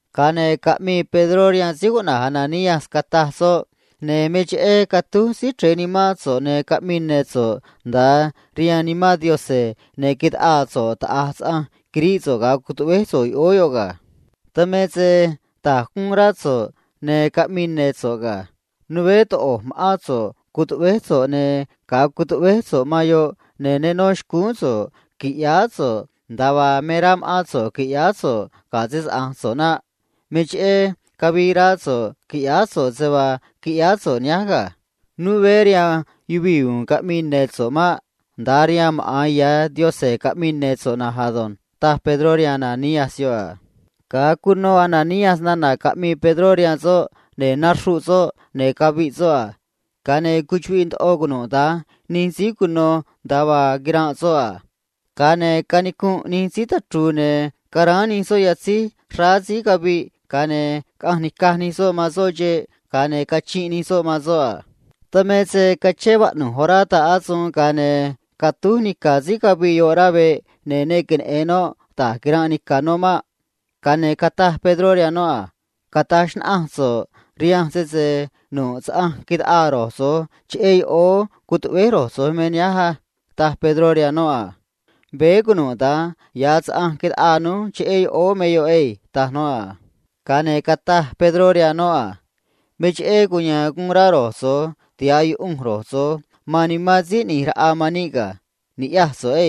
Ga̱a ne̱ caꞌmii Pedró rihaan Ananías, cataj soꞌ a: ―Me cheꞌé catúj Síí Chre̱e nimán so̱ꞌ, ne̱ caꞌmii ne̱ so̱ꞌ nda̱a rihaan Nimán Yaꞌanj, ne̱ taꞌaa so̱ꞌ taꞌa̱j saꞌanj quiríꞌ so̱ꞌ ga̱a cutuꞌvéj so̱ꞌ yoꞌóó yoꞌ ga̱. Dan me se da̱j guun rá so̱ꞌ, ne̱ caꞌmii ne̱ so̱ꞌ ga̱. Né toꞌo̱j ma̱ꞌán so̱ꞌ cutuꞌvéj so̱ꞌ ne̱ ga̱a cutuꞌvéj so̱ꞌ man yoꞌ ne̱ ne nó xcúún so̱ꞌ qui̱ꞌyáá so̱ꞌ nda̱a vaa me rá ma̱ꞌán so̱ꞌ qui̱ꞌyáá so̱ꞌ ga̱ se‑saꞌa̱nj so̱ꞌ naꞌ. Me cheꞌé cavii raá so̱ꞌ qui̱ꞌyáá so̱ꞌ se vaa quiꞌyáá so̱ꞌ nihánj ga̱. Né rihaan yuvii̱ u̱u̱n caꞌmii ne̱ so̱ꞌ maꞌ. Nda̱a rihaan maꞌa̱n ya̱ Yaꞌanj caꞌmii ne̱ so̱ꞌ na̱nj ado̱nj ―taj Pedró rihaan Ananías yoꞌ a. Ga̱a cuno Ananías nana̱ caꞌmii Pedró rihaan soꞌ, ne̱ naxruꞌ soꞌ, ne̱ caviꞌ soꞌ a. Ga̱a ne̱ cuchuꞌviꞌ ndoꞌo cunuda̱nj nij síí cuno nda̱a vaa quiranꞌ soꞌ a. Ga̱a ne̱ canicunꞌ nij síí tachru̱u̱, ne̱ nacutáj nij soꞌ yatzíj man cúú man síí caviꞌ, ga̱a ne̱ caꞌanj nica̱j nij soꞌ man soꞌ xeꞌ, ga̱a ne̱ cachinꞌ nij soꞌ man soꞌ a. Dan me se cachén vaꞌnu̱j orá ta̱ꞌ asuun, ga̱a ne̱ catúj nica̱ síí caviꞌ yoꞌ rá veꞌ, ne̱ ne queneꞌe̱n noꞌ da̱j quiranꞌ nica̱ noꞌ maꞌ. Ga̱a ne̱ cataj Pedró rihaan noꞌ a: ―Cata̱j xnaꞌanj so̱ꞌ rihanj sese nu̱ꞌ saꞌanj taꞌaa ro̱j so̱j cheꞌé yoꞌóó cutuꞌvéj ro̱j so̱j me nihánj á ―taj Pedró rihaan noꞌ a. ―Veé cunuda̱nj ya̱ saꞌanj taꞌaa rój cheꞌé yoꞌóó me yoꞌ chugua̱nj ―taj noꞌ a. Ga̱a ne̱ cataj Pedró rihaan noꞌ a: ―Me cheꞌé cuya̱a̱n guun rá ro̱j so̱j tiha̱ꞌ yuꞌunj ro̱j so̱j man Nimán Síí ꞌNi̱j Raꞌa man níꞌ ga̱. Ni̱ꞌyaj so̱ꞌ á.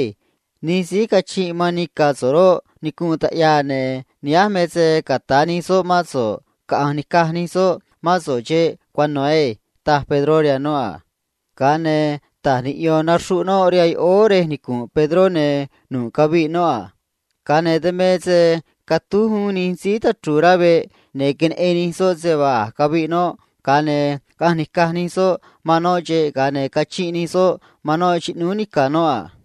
Nij síí cachinꞌ man nica̱ so̱ꞌ roꞌ, nicunꞌ taꞌyaa, ne̱ nihánj me se ca̱ta̱ nij soꞌ mán so̱ꞌ, caꞌa̱nj ni̱caj nij soꞌ mán so̱ꞌ xeꞌ cuano̱ na̱nj ado̱nj ―taj Pedró rihaan noꞌ a. Ga̱a ne̱ ta̱j niꞌyo̱n naxruꞌ noꞌ rihaan yoꞌóó rej nicu̱nꞌ Pedró, ne̱ nu̱ꞌ caviꞌ noꞌ a. Ga̱a ne̱ catúj uún nij síí tachru̱u̱ rá veꞌ, ne̱ queneꞌen nij soꞌ se vaa a̱j caviꞌ noꞌ a. Ga̱a ne̱ caꞌanj nica̱j nij soꞌ cúú man noꞌ xeꞌ, ga̱a ne̱ cachinꞌ nij soꞌ man noꞌ xꞌnúú nica̱ noꞌ a.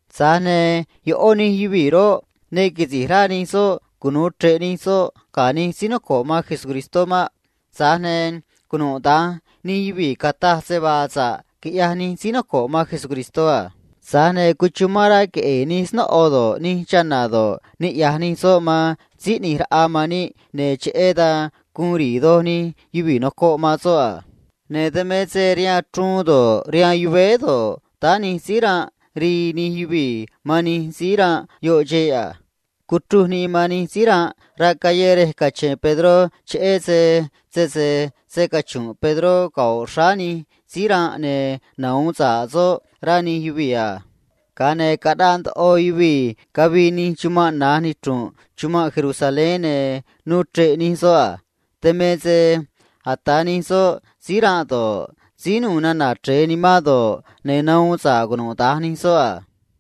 Tza̱j ne̱ ꞌó nij yuvii̱ roꞌ, ne quisi̱j rá nij soꞌ cunu̱u chre̱ꞌ nij soꞌ ga̱ nij síí noco̱ꞌ man Jesús maꞌ. Tza̱j ne̱ cunuda̱nj nij yuvii̱ cataj se vaa sa̱ꞌ uxrá quiꞌyaj nij síí noco̱ꞌ man Jesús a. Cuchumán rá queꞌe̱e̱ ndoꞌo nij snóꞌo do̱ꞌ, nij chana̱ do̱ꞌ, niꞌya̱j nij soꞌ man Jesús Si̱j ꞌNi̱j Raꞌa man níꞌ, ne̱ cheꞌé dan guun ri̱i̱ doj nij yuvii̱ noco̱ꞌ man soꞌ a. Ne̱ dan me se rihaan chruun do̱ꞌ, rihaan yuvéé do̱ꞌ, táá nij síí ranꞌ, rii nij yuvii̱ man nij síí ranꞌ yoꞌ xeꞌ a. Cuchruj nii man nij síí ranꞌ rá callé rej cache̱n Pedró, cheꞌé se sese scachu̱nꞌ Pedró cano̱ xráá nij síí ranꞌ ne̱ nahu̱un nij soꞌ, rá nij yuvii̱ a. Ga̱a ne̱ caꞌnaꞌ ndoꞌo yuvii̱ cavii nij chumanꞌ na̱j nichru̱nꞌ chumanꞌ Jerusalén, ne̱ nuu chre̱ꞌ nij soꞌ a. Dan me se ata̱ nij soꞌ síí ranꞌ do̱ꞌ, síí ranꞌ ndoꞌo sayuun ꞌyaj nana̱ chre̱e nu̱u̱ nimán nij soꞌ do̱ꞌ, ne̱ nahuun sa̱ꞌ cunuda̱nj nij soꞌ a.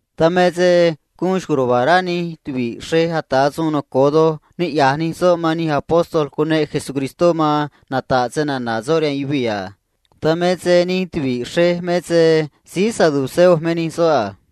Dan me se guun xco̱j ruva̱a̱ rá nij tuvi̱ꞌ xrej ata̱ suun noco̱o doj niꞌya̱j nij soꞌ man nij síí ata̱ suun caꞌa̱nj nata̱ꞌ snana̱ Jesús a. Dan me se nij tuvi̱ꞌ xrej me se síí noco̱ꞌ stucua̱nj nij síí saduceo me nij soꞌ a.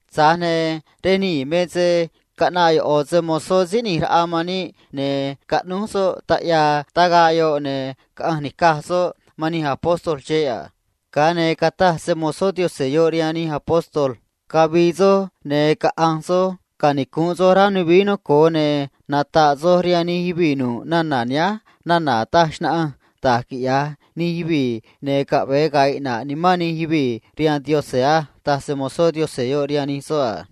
Tza̱j ne̱ rej nii̱ me se caꞌnaꞌ ꞌo̱ se‑mo̱zó Yaꞌanj Si̱j ꞌNi̱j Raꞌa man níꞌ, ne̱ caꞌnúj soꞌ taꞌyaa tagaꞌ yoꞌ, ne̱ caꞌanj nica̱j soꞌ man nij soꞌ xeꞌ a. Ga̱a ne̱ cataj se‑mo̱zó Yaꞌanj yoꞌ rihaan nij soꞌ a: ―Cavi̱i̱ soj, ne̱ caꞌa̱nj soj canicu̱nꞌ soj rej ya̱nj nuvií noco̱o, ne̱ nata̱ꞌ soj rihaan nij yuvii̱ nu̱ꞌ nana̱ nihánj nana̱ taj xnaꞌanj da̱j quiꞌya̱j nij yuvii̱ ne̱ caꞌve̱e ga̱a̱ iꞌna̱ꞌ nimán nij yuvii̱ rihaan Yaꞌanj á ―taj se‑mo̱zó Yaꞌanj yoꞌ rihaan nij soꞌ a.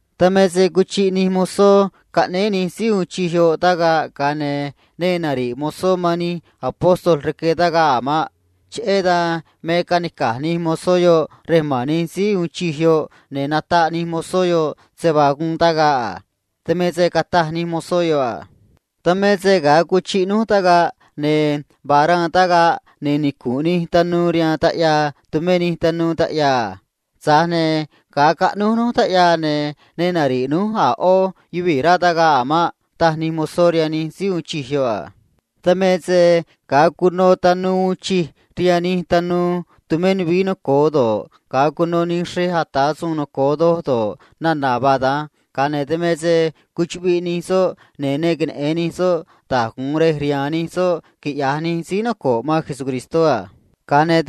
Dan me se cuchiꞌ nij tanuu caꞌnéé nij síí uun chij yoꞌ tagaꞌ, ga̱a ne̱ ne nari̱ꞌ tanuu man nij síí ata̱ suun caꞌa̱nj nata̱ꞌ snana̱ Jesús rque tagaꞌ a̱ maꞌ. Cheꞌé dan me canica̱j nij tanuu yoꞌ rej ma̱n nij síí uun chij yoꞌ, ne̱ nataꞌ nij tanuu yoꞌ se vaa guun tagaꞌ a. Dan me se cataj nij tanuu yoꞌ a: ―Dan me se ga̱a cuchiꞌ núj tagaꞌ, ne̱ vaa xraan tagaꞌ, ne̱ nicu̱nꞌ nij tanuu rihaan taꞌyaa, tumé nij tanuu taꞌyaa a. Tza̱j ne̱ ga̱a caꞌnúj núj taꞌyaa, ne̱ ne nari̱ꞌ núj a̱ ꞌó yuvii̱ rá tagaꞌ a̱ maꞌ ―taj nij tanuu rihaan nij síí uun chij yoꞌ a. Dan me se ga̱a cuno tanuu uun chij rihaan nij tanuu tumé nuvií noco̱o do̱ꞌ, ga̱a cuno nij xrej ata̱ suun noco̱o do̱ꞌ, nana̱ vaa da̱nj, ne̱ caꞌanj rá nij soꞌ, ne̱ ne queneꞌe̱n nij soꞌ da̱j gu̱un rej rihaan nij soꞌ a. Ga̱a ne̱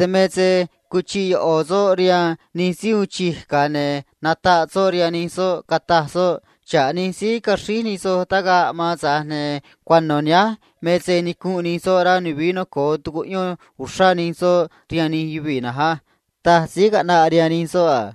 cuchiꞌ ꞌo̱ soꞌ rihaan nij síí uun chij, ga̱a ne̱ nataꞌ soꞌ rihaan nij soꞌ, cataj soꞌ a: ―Xa̱ꞌ nij síí caxríj nij soj tagaꞌ man, tza̱j ne̱ cuano̱ nihánj me se nicu̱nꞌ nij soꞌ rej ya̱nj nuvií noco̱o, tucuꞌyón nij soꞌ rihaan nij yuvii̱ na̱nj á ―taj síí caꞌnaꞌ rihaan nij soꞌ a.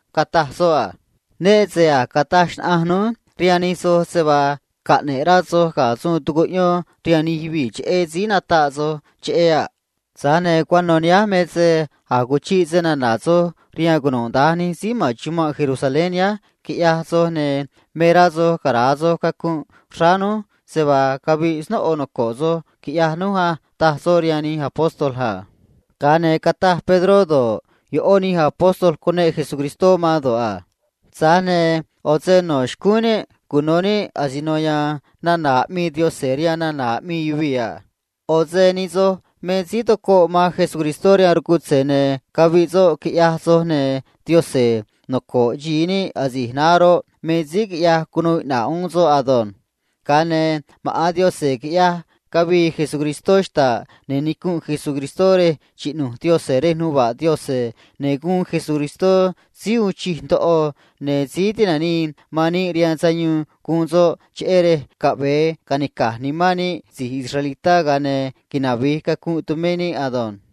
cataj soꞌ a: ―Né se a̱j cataj xnaꞌanj núj rihaan nij soj se vaa caꞌne̱ꞌ rá soj ga̱ suun tucuꞌyón rihaan nij yuvii̱ cheꞌé síí nataꞌ soj cheꞌé a̱ naꞌ. Tza̱j ne̱ cuano̱ nihánj me se a̱j cuchiꞌ stucua̱nj soj rihaan cunuda̱nj nij síí ma̱n chumanꞌ Jerusalén nihánj, quiꞌyaj soj, ne̱ me rá soj cara̱a soj cacunꞌ xráá núj se vaa caviꞌ snóꞌo noco̱ꞌ soj quiꞌyaj núj á ―taj soꞌ rihaan nij síí cuneꞌ Jesús a. Ga̱a ne̱ cataj Pedró do̱ꞌ, ꞌó nij síí cuneꞌ Jesús do̱ꞌ a: ―Tza̱j ne̱ ꞌo̱ se no̱ xcúún níꞌ cuno̱ níꞌ asino ya̱a̱n nana̱ aꞌmii Yaꞌanj rihaan nana̱ aꞌmii yuvii̱ a. ꞌO̱ se nij soj me síí tocoꞌ man Jesús rihaan rcutze̱, ne̱ caviꞌ soꞌ, quiꞌyaj soj a. Tza̱j ne̱ Yaꞌanj noco̱ꞌ xi̱i níꞌ asi̱j naá roꞌ, me síí quiꞌyaj cunuu iꞌna̱ꞌ uún soꞌ ado̱nj. Ga̱a ne̱ maꞌa̱n Yaꞌanj quiꞌyaj cavii Jesús xta̱ꞌ, ne̱ nicu̱nꞌ Jesús rej xꞌnu̱j Yaꞌanj rej nuva̱ꞌ Yaꞌanj a. Ne̱ guun Jesús Síí Uun Chij Ndoꞌo, ne̱ Síí Tinanii man Yuvii̱ rihaan Sayuun guun soꞌ, cheꞌé rej caꞌve̱e ca̱nica̱j nimán níꞌ si̱j israelitá ga̱a ne̱ navi̱j cacunꞌ tumé níꞌ ado̱nj.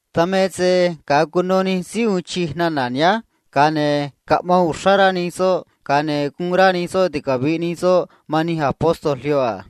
Dan me se ga̱a cuno nij síí uun chij nana̱ nihánj, ga̱a ne̱ cuyanj rá nij soꞌ, ga̱a ne̱ guun rá nij soꞌ ticavi̱ꞌ nij soꞌ man nij síí cuneꞌ Jesús a.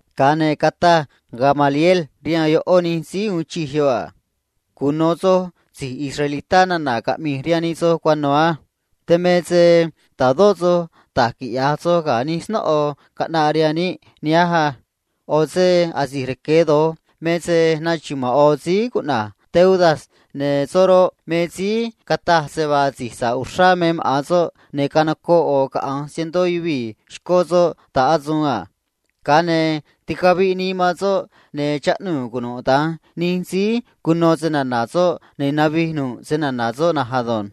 Ga̱a ne̱ cataj Gamaliel rihaan ꞌó nij síí uun chij yoꞌ a: ―Cuno̱ soj si̱j israelitá nana̱ caꞌmi̱j rihaan nij soj cuano̱ á. Dan me se ta̱dó soj da̱j quiꞌya̱j soj ga̱ nij snóꞌo caꞌnaꞌ rihaan níꞌ nihánj á. ꞌO̱ se asi̱j rque̱ doj me se nachuma̱a̱n ꞌo̱ síí cuꞌna̱j Teudas, ne̱ soꞌ roꞌ, me síí cataj se vaa si̱j sa̱ꞌ uxrá me maꞌa̱n soꞌ, ne̱ canocoꞌ ꞌo̱ caꞌa̱nj cientó yuvii̱ xcó soꞌ ta̱ꞌ asuun a. Ga̱a ne̱ ticaviꞌ nii man soꞌ, ne̱ chaꞌnuu̱ cunuda̱nj nij síí cuno snana̱ soꞌ, ne̱ navij nu̱ꞌ snana̱ soꞌ na̱nj ado̱nj.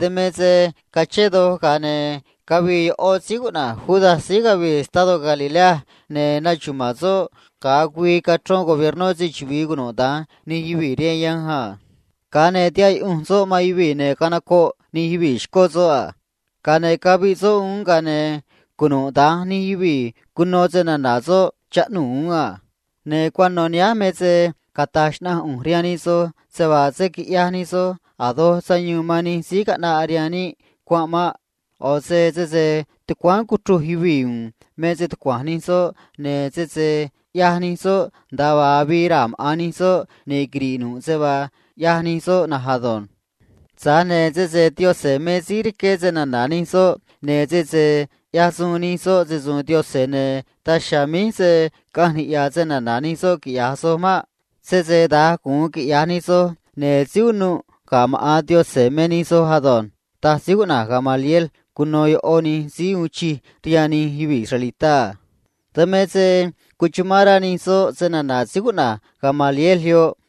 Dan me se cachén doj, ga̱a ne̱ cavii ꞌó síí cuꞌna̱j Judas síí cavii estadó Galilea, ne̱ nachuma̱a̱n soꞌ ga̱a güii cachrón gobiernó se‑chuvi̱i cunuda̱nj nij yuvii̱ rihaan yanj a. Ga̱a ne̱ tihaꞌ soꞌ man yuvii̱, ne̱ canocoꞌ nij yuvii̱ xcó soꞌ a. Tza̱j ne̱ ticaviꞌ nii man soꞌ uún, ga̱a ne̱ cunuda̱nj nij yuvii̱ cuno snana̱ soꞌ chaꞌnuu̱ uún a. ’Ne̱ cuano̱ nihánj me se cata̱j xnaꞌanj ꞌu̱nj rihaan nij soj se vaa se̱ quiꞌyaj nij soj a̱ doj sayuun man nij síí caꞌnaꞌ rihaan níꞌ cuanꞌ maꞌ. ꞌO̱ se sese tucuáán cuchruj yuvii̱ u̱u̱n me stucua̱nj nij soꞌ, ne̱ sese ꞌyaj nij soꞌ nda̱a vaa avii raa̱ maꞌa̱n nij soꞌ, ne̱ quiri̱ꞌ nu̱ꞌ se vaa ꞌyaj nij soꞌ na̱nj ado̱nj. Tza̱j ne̱ sese Yaꞌanj me síí rqué snana̱ nij soꞌ, ne̱ sese ꞌyaj nij soꞌ se‑su̱u̱n Yaꞌanj, ne̱ daj chiha̱a̱ míj se̱ caꞌanj niꞌya̱ snana̱ nij soꞌ quiꞌya̱j soj maꞌ. Sese da̱nj gu̱un quiꞌya̱j nij soj, ne̱ síí unuꞌ ga̱ maꞌa̱n Yaꞌanj me nij soj ado̱nj ―taj síí cuꞌna̱j Gamaliel cuno ꞌó nij síí uun chij rihaan nij yuvii̱ israelitá a. Dan me se cuchumán rá nij soꞌ snana̱ síí cuꞌna̱j Gamaliel yoꞌ,